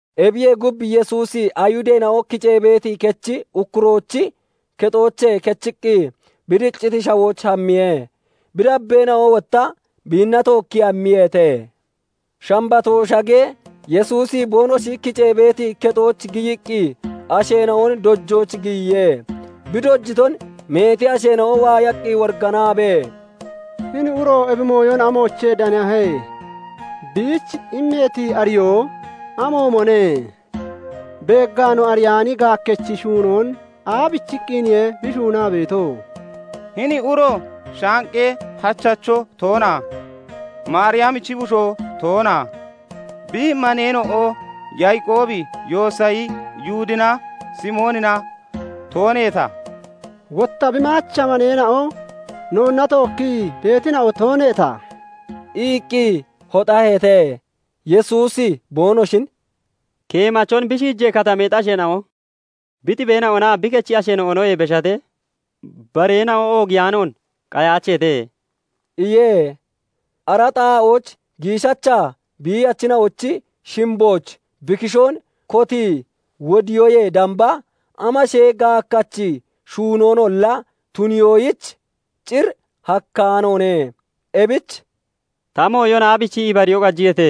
Ebiyee gub, Yesuusi Ayihudeena'o kicee beeti kechi ukkuroochi kexoochee kechiqqi bi dicciti shawooch hammiye; bi dabbeena'o wotta biinna tookkii hammiyeete. Shambatoo shagee, Yesuusi boonoshi kicee beeti kexooch giyiqqi asheena'on dojooch giyiye. Bi dojiton meeti asheena'o waayaqqi woriganaabee, "Hini uro ebi mooyon amoochee danahe? Biich immeeti ariyoo amoomone? Beeggaa no ariyaani gaakkachi shuunoon aabichiqqiniye bi shuunaa beeto? Hini uro shaaqee hachacho toona? Maariyamichi bushoo toona? Bi maneena'o Yaaqoobi, Yoosayi, Yihudinaa Simoonina tooneeta? Wotta bi maacha maneena'o noonna tookkii beetina'o tooneeta?" iqqi hoxaheete. Yesuusi boonoshin "Keemachon bi shiijee katameexi asheena'o, bi xibeena'onaa bi kechi asheena'onoyee beshatee bareena'o oogiyaanoon qayaacheete" iye. Ara xaa'ooch giishacha biiyachina'ochi shimbooch bi kishoon kotii wodiyoyee damba amashee gaakkachi shuunoonolla tuniyoyich cir hakkaanoone. Ebich "Ta mooyon aabichii ibariyoo qajiyeete?"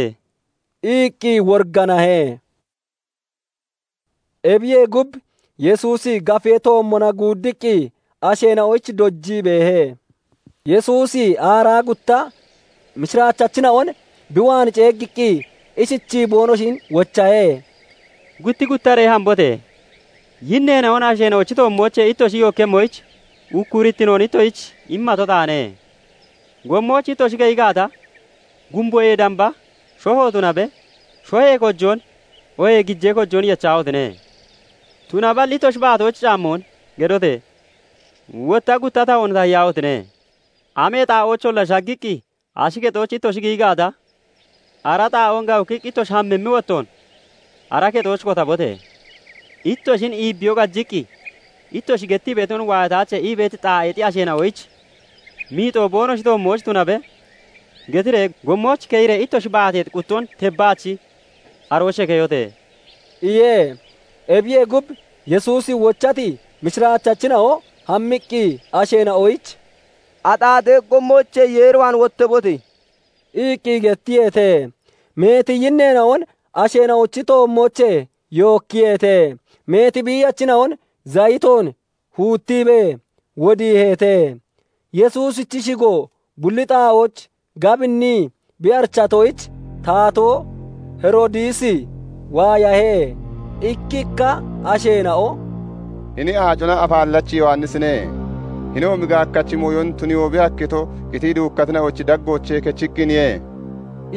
iqqi woriganahe. Ebiyee gub, Yesuusi gaafee toommona guuddiqqi asheena'oyich dojii beehe. Yesuusi aaraa gutta mishiraachachina'on bi waan ceeggiqqi ishichii boonoshin wochahe; "Gutti guttaree hambote! Yinneena'on asheena'ochi toommoochee ittoshi yookkemmoyich ukkurittinoon ittoshich immato taane. Gommooch ittoshi keyi gaata, gumboyee damba shoho tunabe, shohee kojoon oohee gijee kojoon yechahotine! Tunaballi ittoshi baatooch caammoon geddote! Wotta gutta tahoon tahiyaahotine! Amee xaa'oocholla shaggiqqi ashi kexooch ittoshi giyi gaata, ara xaa'oon gawukkiqqi ittoshi hammimmi wottoon ara kexooch kotabote! Ittoshin iibbiyoo qajiqqi, 'Ittoshi gettii beeton waayataache' ii beeti xaa'eexi asheena'oyich, 'Miixoo boonoshi toommooch tunabe' getiree gommooch keyiree ittoshi baateexi quttoon tebbaachi aroochee keyote!" iye. Ebiyee gub, Yesuusi wochati mishiraachachina'o hammiqqi asheena'oyich "Axaaxee gommoochee Yeer waan wottabote!" iqqi gettiyeete. Meeti yinneena'on asheena'ochi toommoochee yookkiyeete. Meeti biiyachina'on zayitoon huuttiibee wodiiheete. Yesuusichi shigo bulli xaa'ooch gabinnii bi arichatoyich, taatoo Heroodisi waayahe. Ikkikka asheena'o "Hini Aacona Afaallachi Yowannisine; hinoomi gaakkachi mooyon tuniyoo bi hakkito, qitii duukkatina'ochi daggoochee kechiqqiniye"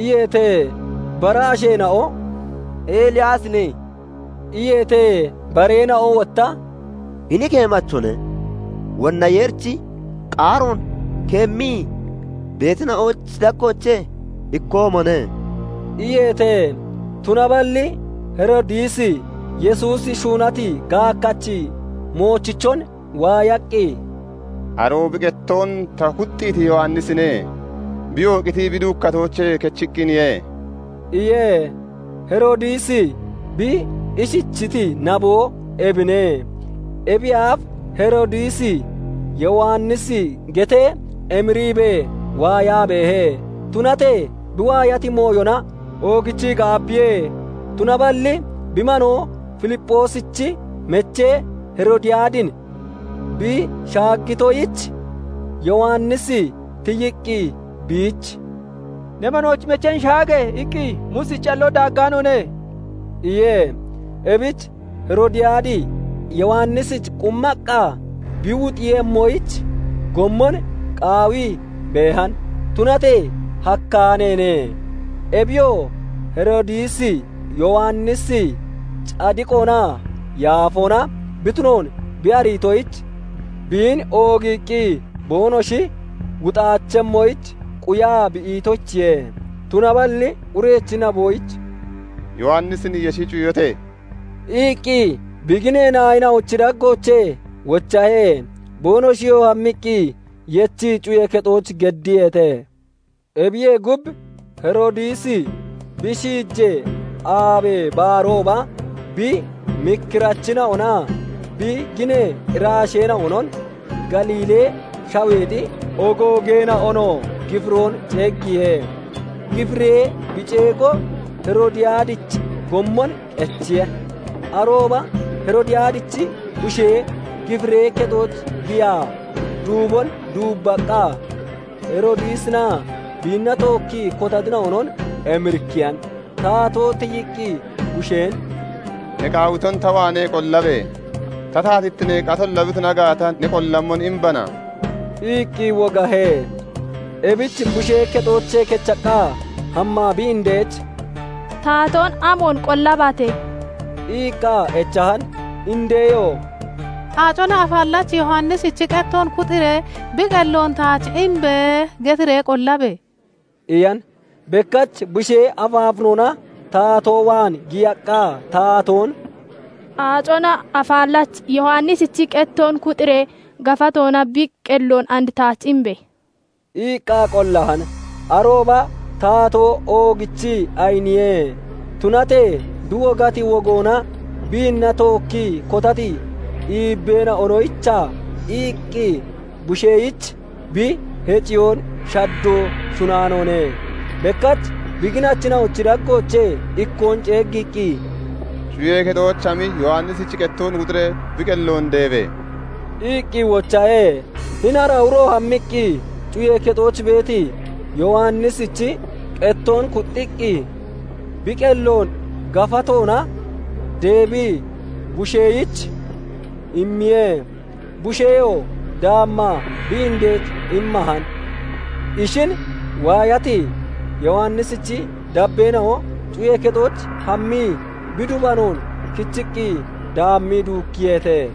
iyeete. Bara asheena'o "Eliyaasine" iyeete. Bareena'o wotta "Hini keemachone; wonna Yeerichi qaaroon keemmii beetina'ochi daggoochee ikkoomone" iyeete. Tunaballi Heroodisi Yesuusi shuunati gaakkachi moochichon waayaqqi, "Aroo bi qettoon ta kuxxiiti Yowannisine; biyoo qitii bi duukkatoochee kechiqqiniye" iye. Heroodisi bi ishichiti naboo ebine; ebiyee aaf Heroodisi Yowannisi getee emiriibee waayaa beehe; tunatee bi waayati mooyona oogichii gaabbiye. Tunaballi bi manoo Filipphoosichi mechee Heroodiyaadin bi shaaggitoyich, Yowannisi tiyiqqi biich " 'Ne manoochi mecheen shaage!' iqqi Muusichi calloo daaggaanoone" iye. Ebich Heroodiyaadi Yowannisich qummaqqa bi wuxeeyemmoyich gommon qaawii beehan; Tunatee hakkaaneene. Ebiyoo Heroodisi Yowannisi cadiqoonaa yaafoona bi tunoon bi ariitoyich, biin oogiiqqi boonoshi wuxaachemmoyich quyaa bi itoyichiye. Tunaballi urechi naboyich "Yowannisin yeshi cuyote!" iqqi bi ginee naayina'ochi daggoochee wochahe. Boonoshiyoo hammiqqi yechii cuyee kexooch geddiyeete. Ebiyee gub, Heroodisi bi shiijee aabee baarooba bi mikkirachina'onaa bi ginee irasheena'onon, Galiilee Shaweexi ogoogeena'onoo gifiroon ceeggiye. Gifiree bi ceego Heroodiyaadich gommon qechiye. Arooba Heroodiyaadichi bushee gifiree kexooch giyaa duubon duubbaqqa Heroodisinaa biinna tookkii kotatina'onon emirikkiyan. Taatoo tiyiqqi busheen "Ne qaawiton ta waanee qollabe! Ta taatittinee qatolla bi tuna gaata, ne qollammon imbana" iqqi wogahe. Ebich bushee kexoochee kechaqqa hammaa bi indech "Taatoon amoon qollabate?" iqqa echahan. Indeyoo " 'Aacona Afaallachi Yowannisichi qettoon kuxiiree bi qelloon taach imbe!' getiree qollabe!" iyan. Bekkach bushee afaafinoona taatoo waan giyaqqa taatoon "Aacona Afaallachi Yowannisichi qettoon kuxiiree gafatoona bi qelloon and taach imbe!" iqqa qollahan. Arooba taatoo oogichii ayiniye; tunatee bi wogati wogoonaa biinna tookkii kotati iibbeena'onoyicha iqqi busheyich bi heciyoon shaddoo shunnaanoone. Bekkach bi ginachina'ochi daggoochee ikkoon ceeggiqqi, "Cuyee kexooch hami Yowannisichi qettoon kuxiree bi qelloon deebe!" iqqi wochahe. Hini ara uro hammiqqi cuyee kexooch beeti Yowannisichi qettoon kuxxiqqi, bi qelloon gafatoona deebii busheyich immiye. Busheyoo daammaa bi indech immahan. Ishin waayati Yowannisichi dabbeena'o cuyee kexooch hammii bi dubanoon kichiqqi daammii duukkiyeete.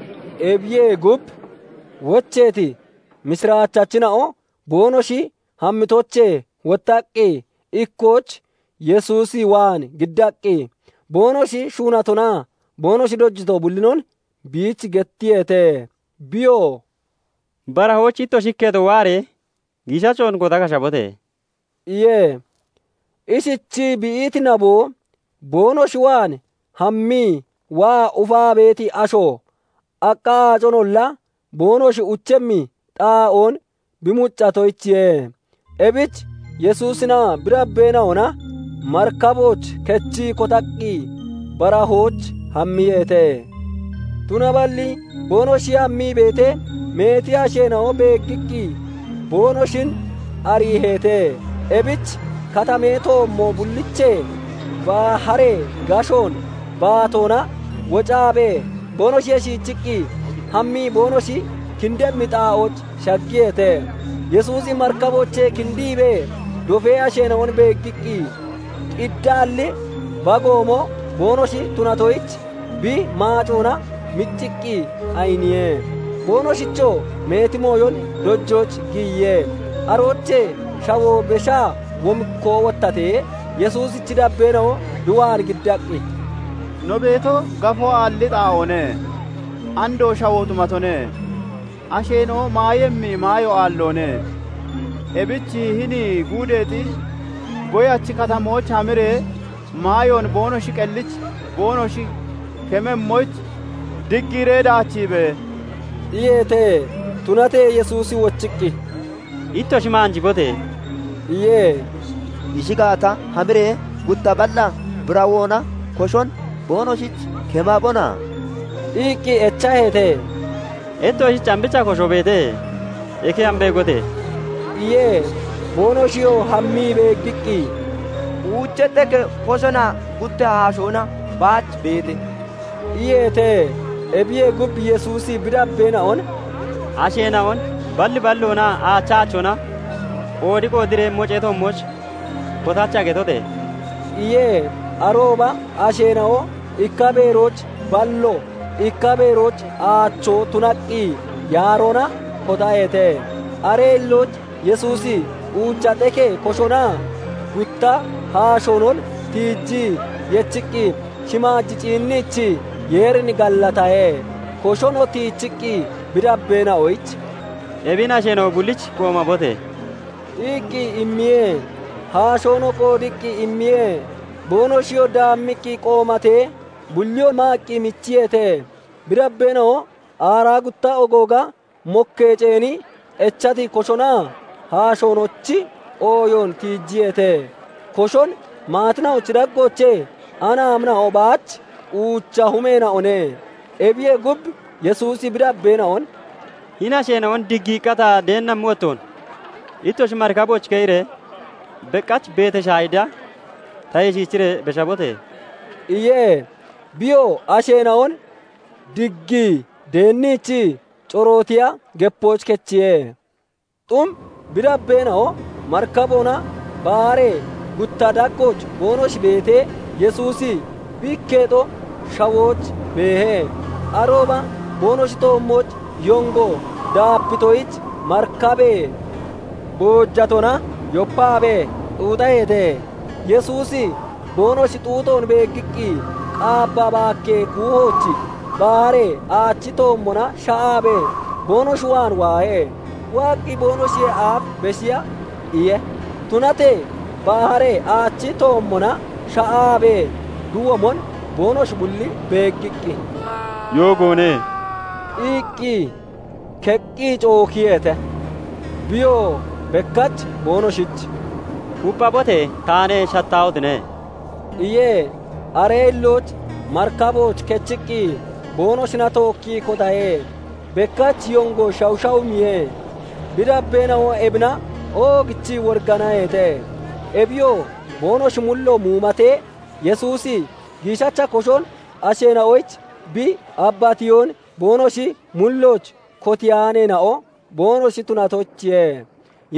Ebiyee gub, wocheeti mishiraachachina'o boonoshi hammitoochee wottaqqi ikkooch Yesuus waan giddaqqi, boonoshi shuunatonaa boonoshi dojito bullinon biich gettiyeete. Biyoo "Barahooch ittoshi ikketo waaree giishachon kota kashabote!" iye. Ishichii bi iti naboo, boonoshi waan hammii waa ufaa beeti asho aqqa aaconolla boonoshi uchemmi xaa'oon bi mucciitoyichiye. Ebich Yesuusinaa bi dabbeena'ona marikabooch kechii kotaqqi barahooch hammiyeete. Tunaballi boonoshi hammii beetee, meeti asheena'o beeggiqqi boonoshin ariiheete. Ebich katamee toommo bulliichee baharee gashoon baatoona wocaabee, boonoshiyee shiichiqqi hammii boonoshi kindemmi xaa'ooch shaggiyeete. Yesuusi marikaboochee kindiibee dofee asheena'on beeggiqqi, qiddaalli bagoomo boonoshi tunatoyich bi maacoona micciqqi ayiniye. Boonoshichoo meeti mooyon dojooch giyiye. Aroochee shawoo beshaa womikkoo wottatee, Yesuusichi dabbeena'o bi waan giddaqqi, "No beeto, gafoo aalli xaa'oone; andoo shawoo xumatone. Asheena'o maayemmi maayo aalloone. Ebich hini guudeexi goyachi katamooch hamiree maayoon boonoshi qellich boonoshi kememmoyich diggiiree daachiibe!" iyeete. Tunatee Yesuusi wochiqqi, "Ittoshi maanjibote!" iye. "Ishi gaata, hamiree gutta balla birawoona koshon boonoshich kemabona?" iqqi echaheete. "Ittoshich ambicha kosho beete? Eke hami beegote!" iye. Boonoshiyoo hammii beeggiqqi, "Uucha xekee koshonaa gutta haashoona baach beete" iyeete. Ebiyee gub, Yesuusi bi dabbeena'on "Asheena'on 'Balli balloonaa aachi aachoona qoodi qoodeeree mocee toommooch kotacha!' getote!" iye. Arooba asheena'o ikka beerooch ballo, ikka beerooch aachoo tunaqqi yaaroona kotaheete. Aree hillooch Yesuusi uucha xekee koshonaa gutta haashoonon tiijii yechiqqi shimaaj ciinniichii Yeerin gallatahe. Koshon tiichiqqi bi dabbeena'oyich "Ebin asheena'o bullich qoomabote!" iqqi immiye; haashoonoo qoodiqqi immiye. Boonoshiyoo daammiqqi qoomatee, bulliyoo maaqqi michiyeete. Bi dabbeena'o aaraa gutta ogooga mokkee ceeni, echati koshonaa haashoonochi ooyoon tiijiyeete. Koshon maatina'ochi daggoochee anaamina'o baach uucha humeena'one. Ebiyee gub, Yesuusi bi dabbeena'on "Hini asheena'on diggiiqqa ta deennammi wottoon, ittoshi marikabooch keyiree beqach Betashayida tayee shiichiree beshabote!" iye. Biyoo asheena'on diggii deenniichii corootiya gepooch kechiye. Xum bi dabbeena'o marikaboona baharee gutta daggooch boonoshi beetee, Yesuusi bi ikketo shawooch beehe. Arooba boonoshi toommooch yongo daapitoyich marikabee boojatoona yopaabee xuuxaheete. Yesuusi boonoshi xuuxoon beeggiqqi, qaabba baakkee kuuhooch baharee aachi toommona sha'aabee boonoshi waan waahe; waaqqi boonoshiyee aaf beshiya iye. Tunatee baharee aachi toommona shaa'aabee bi womon boonoshi bulli beeggiqqi, "Yoogoone" iqqi keqqi cookiyeete. Biyoo bekkach boonoshich "Kupphabote! Taane; shattaahotine! " iye. Aree hillooch marikabooch kechiqqi boonoshina tookkii kotahe. Bekkach yongo shashawumiye. Bi dabbeena'o ebina oogichii woriganaheete. Ebiyoo boonoshi mullo muumatee, Yesuusi giishacha koshon asheena'oyich bi abbatiyoon boonoshi mullooch kotiyaaneena'o boonoshi tunatoyichiye.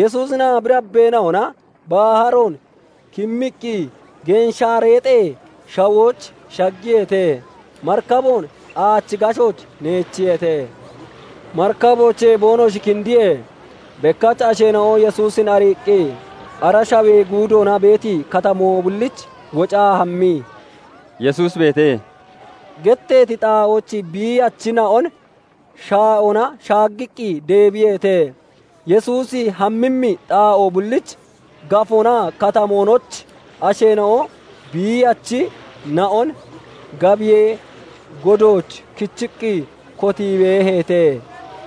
Yesuusinaa bi dabbeena'ona baharoon kimmiqqi Genshaareexee shawooch shaggiyeete; marikaboon aachi gashooch neechiyeete. Marikaboochee boonoshi kindiyee, bekkach asheena'o Yesuusin ariiqqi, ara shawee guudoona beeti katamoo bulliich wocaa hammii, "Yesuusi beete" getteeti xaa'ooch biiyachina'on shaa'oona shaaggaqqi deebiyeete. Yesuusi hammimmi xaa'o bulliich, gafoonaa katamoonooch asheena'o biiyachina'on gabiyee godooch kichiqqi kotii beeheete.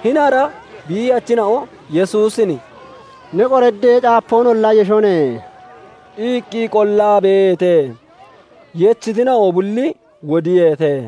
Hini ara biiyachina'o Yesuusin "Ne qoraddee caapoonolla yeshone" iqqi qollaa beeheete. Yechitina'o bulli wodiyeete.